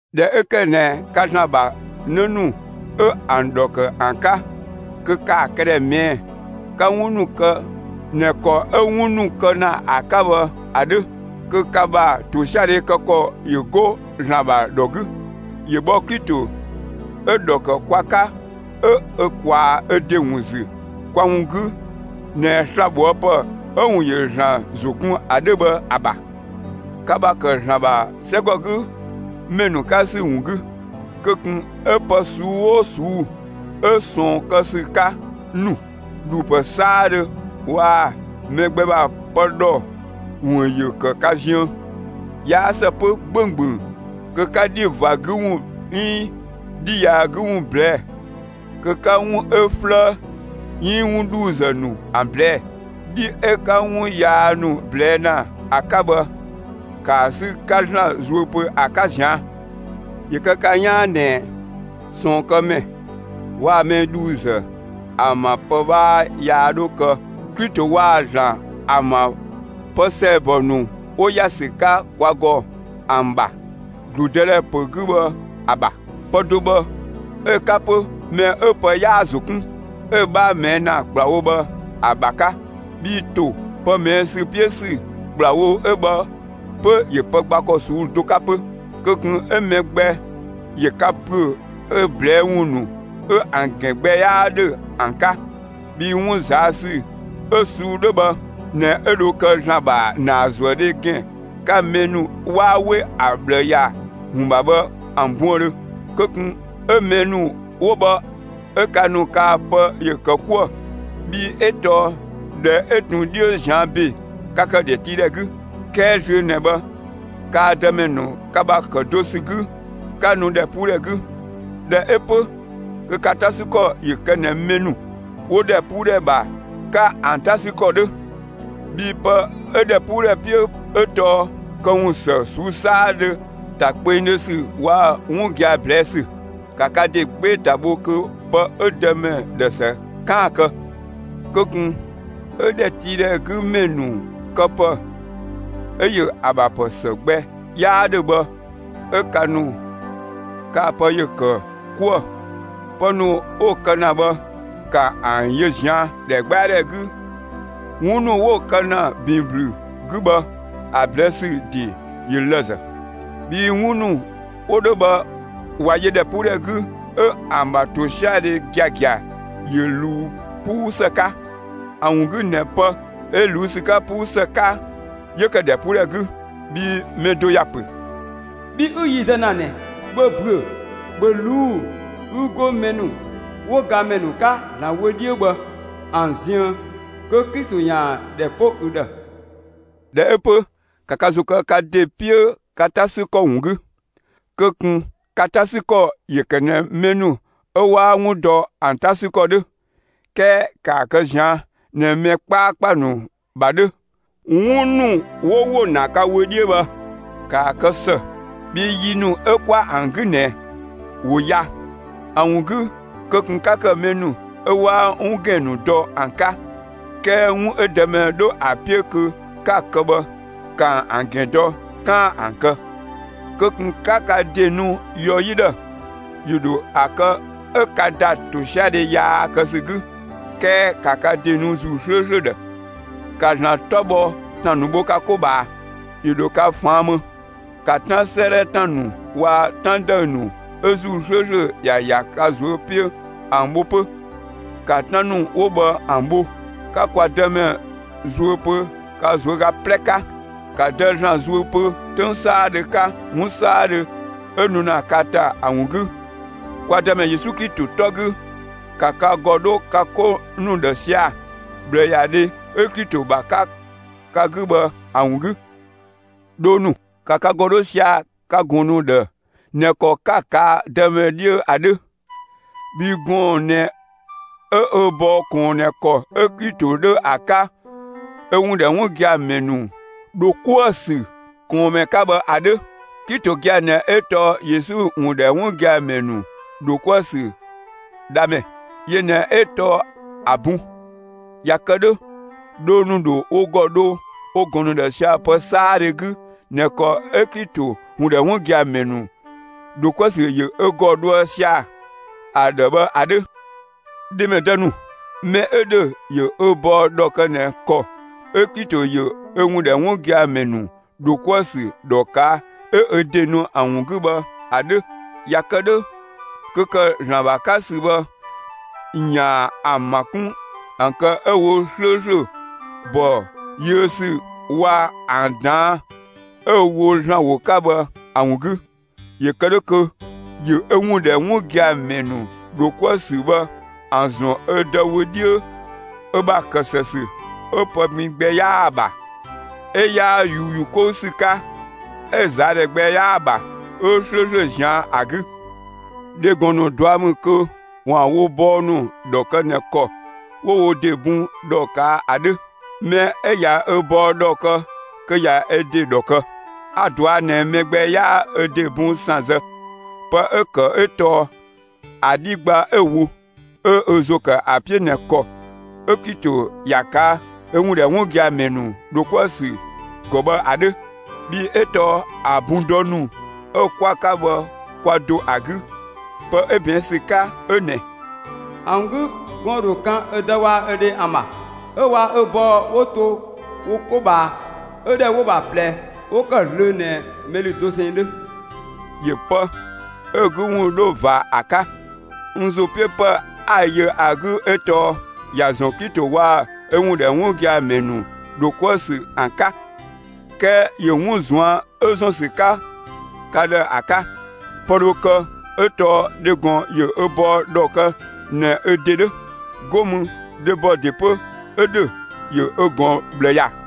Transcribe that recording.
꞊Dhɛ 'ö ‑kë ꞊nɛ ka ‑Zlan ‑bha 'në ‑nu 'ö ‑an ‑dhɔ ‑kë ‑an 'ka, kö ‑kaa këdhɛ ꞊mɛɛ'‑ 'ka 'wun ‑nu kë ꞊nɛ ‑kɔ 'ö 'wun ‑nu kë ‑na ‑a 'ka bhë ‑a 'dhö. Kö ka ‑bha ‑tosiadhe kë ‑kɔ ‑yö 'go ‑Zlan ‑bha ‑dhɔ 'gü. ‑Yö bhɔ Klito 'ö‑ ‑dhɔ ‑kë kwa 'ka 'ö ö ꞊kwaa ö ‑de ‑wun ‑zü kwa ‑wun 'gü ꞊nɛ slabhoëpë 'ö‑ ‑wun ‑yö ‑Zlan ‑zo kun ‑a 'dhö bhë ‑a ‑bha. Ka ‑bha ‑kë ‑Zlan ‑bha 'sɛgɔgümɛ 'ka ‑sü ‑wun 'gü, kö ꞊kun 'ö pë ꞊suu'‑ 'oo ꞊suu'‑ 'ö ꞊sɔɔn kë ‑sü 'ka ‑nu, ‑dhuupë 'saadhö waa‑ mɛ gbɛ ‑bha pë ‑dhɔ ‑wun ‑yö ‑kë ka ziën. 'Yaa ‑së 'pö 'gbönggböng kö 'ka 'dhi ꞊va 'gü ‑wun 'iin 'dhi yaa 'gü ‑wun ꞊blɛɛ'‑, kö 'ka 'wun 'ö 'flëë 'iin 'wun ‑dhuuzë ‑nu ‑an ꞊blɛɛ'‑. 'Dhi 'ö 'ka 'wun yaa ‑nu ꞊blɛɛ' ‑na ‑a 'ka bhë, ‑kaa 'sü 'ka ‑Zlan zuö pö ‑a 'ka ꞊zian'. ‑Yö kë ka 'yaan ꞊nɛ ꞊sɔɔnkëmɛ waa‑ mɛ ‑dhuuzë ‑an ‑bha pë 'bhaa yaa 'dho kë Klito waa‑ ‑Zlan ‑an ‑bha pë ‑sɛɛbɔ ‑nu 'wo ‑ya ‑sü 'ka kwa ‑gɔ ‑an ‑bha ‑gludëdhɛ ‑pö 'gü bhë ‑a ‑bha. Pë do bhë 'ö‑ 'ka 'pö, mɛ 'ö pë 'yaa‑ ‑zo kun, 'ö‑ 'bhaa ꞊mɛɛ' ‑na ‑kplawo bhë ‑a ‑bha 'ka (bhii ‑to pë ꞊mɛɛ' ‑sü 'piö ‑sü ‑kplawo 'ö bhë 'pö ‑yö pë gba ‑kɔ ꞊suu'‑ do 'ka 'pö.) Kö ꞊kun 'ö mɛ gbɛ ‑yö ka ‑püö ö ꞊blɛɛ' ‑wun ‑nu 'ö ‑an ‑gɛn gbɛ 'yaa ‑dhö ‑an 'ka! Bhii 'wun ꞊zaa' ‑sü 'ö‑ ꞊suu'‑ 'dhö bhë ꞊nɛ 'ö dho kë ‑Zlan ‑bha ‑naazuëdhe ‑gɛn 'ka mɛ ‑nu 'waa 'we ‑a ꞊bhlë ‑ya ‑wun ‑bha bhë ‑an buëndhö. Kö ꞊kun 'ö mɛ ‑nu 'wo bhë 'ö ka ‑nu kaa‑ pë ‑yö ‑kë 'kuë‑! Bhii 'ö tɔɔ ꞊dhɛ 'ö ꞊tun 'dhiö ꞊zian' ‑be, ka ‑kë ‑dhɛtiidhɛ 'gü, 'kɛɛ zlöö ꞊nɛ bhë kaa‑ Dëmɛ ‑nu ka ‑bha ‑kë do ‑sü 'gü, 'ka nu ‑dhɛpuudhɛ 'gü. ꞊Dhɛ 'ö 'pö kö ka 'ta 'sü ‑kɔ ‑yö kë ꞊nɛ mɛ ‑nu 'wo ‑dhɛpuudhɛ ‑bha 'ka ‑an 'ta 'sü ‑kɔ 'dhö! Bhii pë 'ö ‑dhɛpuudhɛ 'piö 'ö tɔɔ këwun ‑së ꞊suu'‑ 'saadhö, ‑ta kpengdhö ‑sü waa‑ 'wun gia‑ ꞊blɛɛ' ‑sü. ‑Ka ka ‑de 'gbee‑ ‑ta bho kö pë 'ö Dëmɛ ‑dhë ‑së 'kaan‑ ‑a kë! Kö ꞊kun 'ö ‑dhɛtiidhɛ 'gü ‑mɛ ‑nu këpë 'ö‑ ‑yö ‑a ‑bha ‑pë ‑së gbɛ 'yaa 'dhö bhë 'ö ka ‑nu kaa‑ pë ‑yö ‑kë 'kuë‑! Pë ‑nu 'wo‑ kë ‑na bhë, ‑ka ‑an yö ꞊zian' ‑dhɛgbɛadhɛ 'gü! ('Wun ‑nu 'wo‑ kë ‑na ‑bin ‑blü 'gü bhë, ‑a ꞊blɛɛ' ‑sü ‑de ‑yö lëzë.) Bhii 'wun ‑nu 'wo 'dhö bhë ꞊wa yö ‑dhɛpuudhɛ 'gü, 'ö ‑an ‑bha ‑tosiadhe giagia ‑yö ꞊luu 'puu ‑së 'ka. ‑A ‑wun 'gü ꞊nɛ pë 'ö ꞊luu' ‑sü 'ka 'puu ‑së 'ka, 'yö ‑kë ‑dhɛpuudhɛ 'gü. Bhii mɛ do ‑ya ‑pö: Bhi 'ü yi zë ‑na ꞊nɛ, ‑bhö ‑büö; ‑bhö ꞊luu'‑ 'ü 'go mɛ ‑nu 'wo gamɛ ‑nu 'ka ‑Zlan wö 'dhiö bhë ‑an ziën, kö Klito ‑yaan ‑dhɛ 'po ü ‑dhë! ꞊Dhɛ 'ö 'pö, ‑ka ka ‑zo kë ka ‑de 'piö ka 'ta ‑sü ‑kɔ ‑wun 'gü. Kö ꞊kun ka 'ta 'sü ‑kɔ ‑yö ‑kë ꞊nɛ mɛ ‑nu 'ö 'waa 'wun dɔ ‑an 'ta ‑sü ‑kɔ 'dhö. 'Kɛɛ ‑kaa kë ꞊zian' ꞊nɛ mɛ 'kpaakpa ‑nu ‑bha 'dhö. 'Wun ‑nu 'wo ‑wo ‑na ka wö 'dhiö bhë, ‑kaa kë ‑së, bhii yi ‑nu 'ö 'kwa ‑an 'gü ꞊nɛ ‑wo ya. ‑A ‑wun 'gü, kö ꞊kun 'ka ‑kë mɛ ‑nu 'ö 'waa 'wun ‑gɛn ‑nu dɔ ‑an 'ka; 'kɛɛ 'wun 'ö Dëmɛ 'dho ‑a 'piö kö 'ka‑ kë bhë, 'ka ‑an ‑gɛn dɔ 'kaan‑ ‑an kë. Kö ꞊kun 'ka ka ‑de nu yɔ 'yi ‑dhë! ‑Yö ‑dho ‑a kë 'ö 'ka ‑da ‑tosiadhe yaa kë ‑sü 'gü; 'kɛɛ ‑ka ka ‑de nu ‑Zuu 'slööslö ‑dhë! ‑Ka ‑Zlan 'tɔ bhɔ ‑tan ‑nu bho ka 'ko ꞊bhaa; ‑yö ‑dho ka ꞊faan' më. ‑Ka 'Tan 'sëëdhɛ ‑tan ‑nu waa‑ 'tan ‑dëü ‑nu 'ö ‑Zuu 'slööslö ‑ya ‑ya ka ꞊zuö' 'piö ‑an bho 'pö! ‑Ka 'tan ‑nu 'wo bhë ‑an bho, 'ka kwa Dëmɛ zuö pö ka ꞊zuöga 'plɛ 'ka! ‑Ka Dë ‑Zlan zuö pö 'töng 'saadhö 'ka 'wun 'saadhö 'ö nu ‑na ka ‑ta ‑a ‑wun 'gü kwa Dëmɛ Yesu Klito 'tɔ 'gü! ‑Ka ka ‑gɔ 'dho ka 'ko ‑nu ‑dhë sia‑ ꞊bhlëyadhe 'ö Klito ‑bha 'ka ka 'gü bhë ‑a ‑wun 'gü. Dhoo ‑nu, ‑ka ka ‑gɔ 'dho sia‑ ka ꞊gɔn ‑nu ‑dhë ꞊nɛ ‑kɔ 'ka‑ ꞊kaa' Dëmɛ 'dhiö ‑a 'dhö. Bhii gɔɔn‑ ꞊nɛ 'ö ö bɔɔ ꞊kɔɔn ꞊nɛ ‑kɔ 'ö Klito 'dhö ‑a 'ka ö ‑wun ‑dhɛ 'wun gia‑ ‑mɛ ‑nu ‑dho 'kuë‑ ‑sü ꞊kɔɔnmɛ 'ka bhë ‑a 'dhö. Klito gia‑ ꞊nɛ 'ö tɔɔ Yesu ‑wun ‑dhɛ 'wun gia‑ ‑mɛ ‑nu ‑dho 'kuë‑ ‑sü Dhamɛ; yö ꞊nɛ 'ö tɔɔ ‑a bun. ꞊Ya kë 'dhö, dhoo ‑nu dho wo ‑gɔ dho wo ꞊gɔn ‑nu ‑dhë sia‑ pë 'saadhö 'gü ꞊nɛ ‑kɔ 'ö Klito ‑wun ‑dhɛ 'wun gia‑ ‑mɛ ‑nu ‑dho 'kuë‑ ‑sü ‑yö ö ‑gɔ dhoë sia‑ ‑a ‑dhë bhë ‑a 'dhö. Dhemɛdë ‑nu, mɛ 'ö ‑dhö, ‑yö ö bɔɔ ‑dhɔ kë ꞊nɛ ‑kɔ 'ö Klito ‑yö ö ‑wun ‑dhɛ 'wun gia‑ ‑mɛ ‑nu ‑dho 'kuë‑ ‑sü ‑dhɔ ꞊kaa' 'ö ö ‑de nu ‑a ‑wun 'gü bhë ‑a 'dhö! ‑Ya ‑kë 'dhö kö ‑kë ‑Zlan ‑bha 'ka ‑sü bhë ‑yaan ‑an ‑ma 'kun ‑an kë 'ö‑ wo 'slööslö ‑bɔ yiö ‑sü waa‑ ‑an ꞊daan'‑ 'ö‑ wo ‑Zlan ‑wo 'ka bhë ‑a ‑wun 'gü. ‑Yö kë 'dhö kö ‑yö ö ‑wun ‑dhɛ 'wun gia‑ ‑mɛ ‑nu ‑dho 'kuë‑ ‑sü bhë ‑a ‑zɔn ö ‑de wö 'dhiö ö ‑bha ‑kë ‑së ‑sü, 'ö pë pin gbɛ 'yaa‑ ‑bha, 'ö 'yaa ꞊yuuyu 'kou ‑sü 'ka, 'ö ꞊zaadhɛ gbɛ 'yaa‑ ‑bha, 'ö 'slööslö ꞊zian' ‑a 'gü. Dhegɔn ‑nu ꞊dua' ‑mü kö ‑waan wo bɔɔ ‑nu ‑dhɔ kë ꞊nɛ ‑kɔ 'wo wo ‑de bun ‑dhɔ ꞊kaa' ‑a 'dhö. Mɛ 'ö ꞊ya ö bɔɔ ‑dhɔ kë kö ꞊ya ö ‑de ‑dhɔ kë. A‑ ꞊dɔa' ꞊nɛ mɛ gbɛ 'yaa ö ‑de bun ‑san zë; pë 'ö‑ ‑kë 'ö tɔɔ ‑a 'dhi gba 'ö‑ wo, 'ö ö ‑zo ‑kë ‑a 'piö ꞊nɛ ‑kɔ 'ö Klito ‑ya ꞊kaa' ö ‑wun ‑dhɛ 'wun gia‑ ‑mɛ ‑nu ‑dho 'kuë‑ ‑sü ‑gɔ bhë ‑a 'dhö. Bhii 'ö tɔɔ ‑a bun dɔ ‑nu 'ö 'kwa‑ 'ka bhë kwa do ‑a 'gü. Pë 'ö ꞊bɛɛn' ‑sü 'ka 'ö ꞊nɛ: ‑A ‑wun 'gü gɔɔn‑ ‑dho kan ö dë waa‑ ö dhe ‑an ‑bha, 'ö waa‑ ö bɔɔ 'wo ‑to wo 'ko ꞊bhaa; 'ö ‑dhɛ 'wo‑ ‑bha ꞊plɛ 'wo ‑kë zlöö ꞊nɛ mɛ ‑lü dosɛn 'dhö. ‑Yö pë 'ö‑ 'gü ‑wun 'dho ꞊va ‑a 'ka. N ‑zo 'piö pë 'a‑ yö ‑a 'gü 'ö tɔɔ ‑ya ‑zɔn Klito waa‑ ö ‑wun ‑dhɛ 'wun gia‑ ‑mɛ ‑nu ‑dho 'kuë‑ ‑sü ‑an 'ka. 'Kɛɛ ‑yö 'wun ꞊zuan' 'ö ‑zɔn ‑sü 'ka ka ‑dhë ‑a 'ka. Pë dho kë 'ö tɔɔ dhegɔn ‑yö ö bɔɔ ‑dhɔ kë ꞊nɛ ö ‑de 'dhö; 'go mü dhebɔ ‑de 'pö 'ö ‑dhö, ‑yö ö ꞊gɔn ꞊bhlë ‑ya.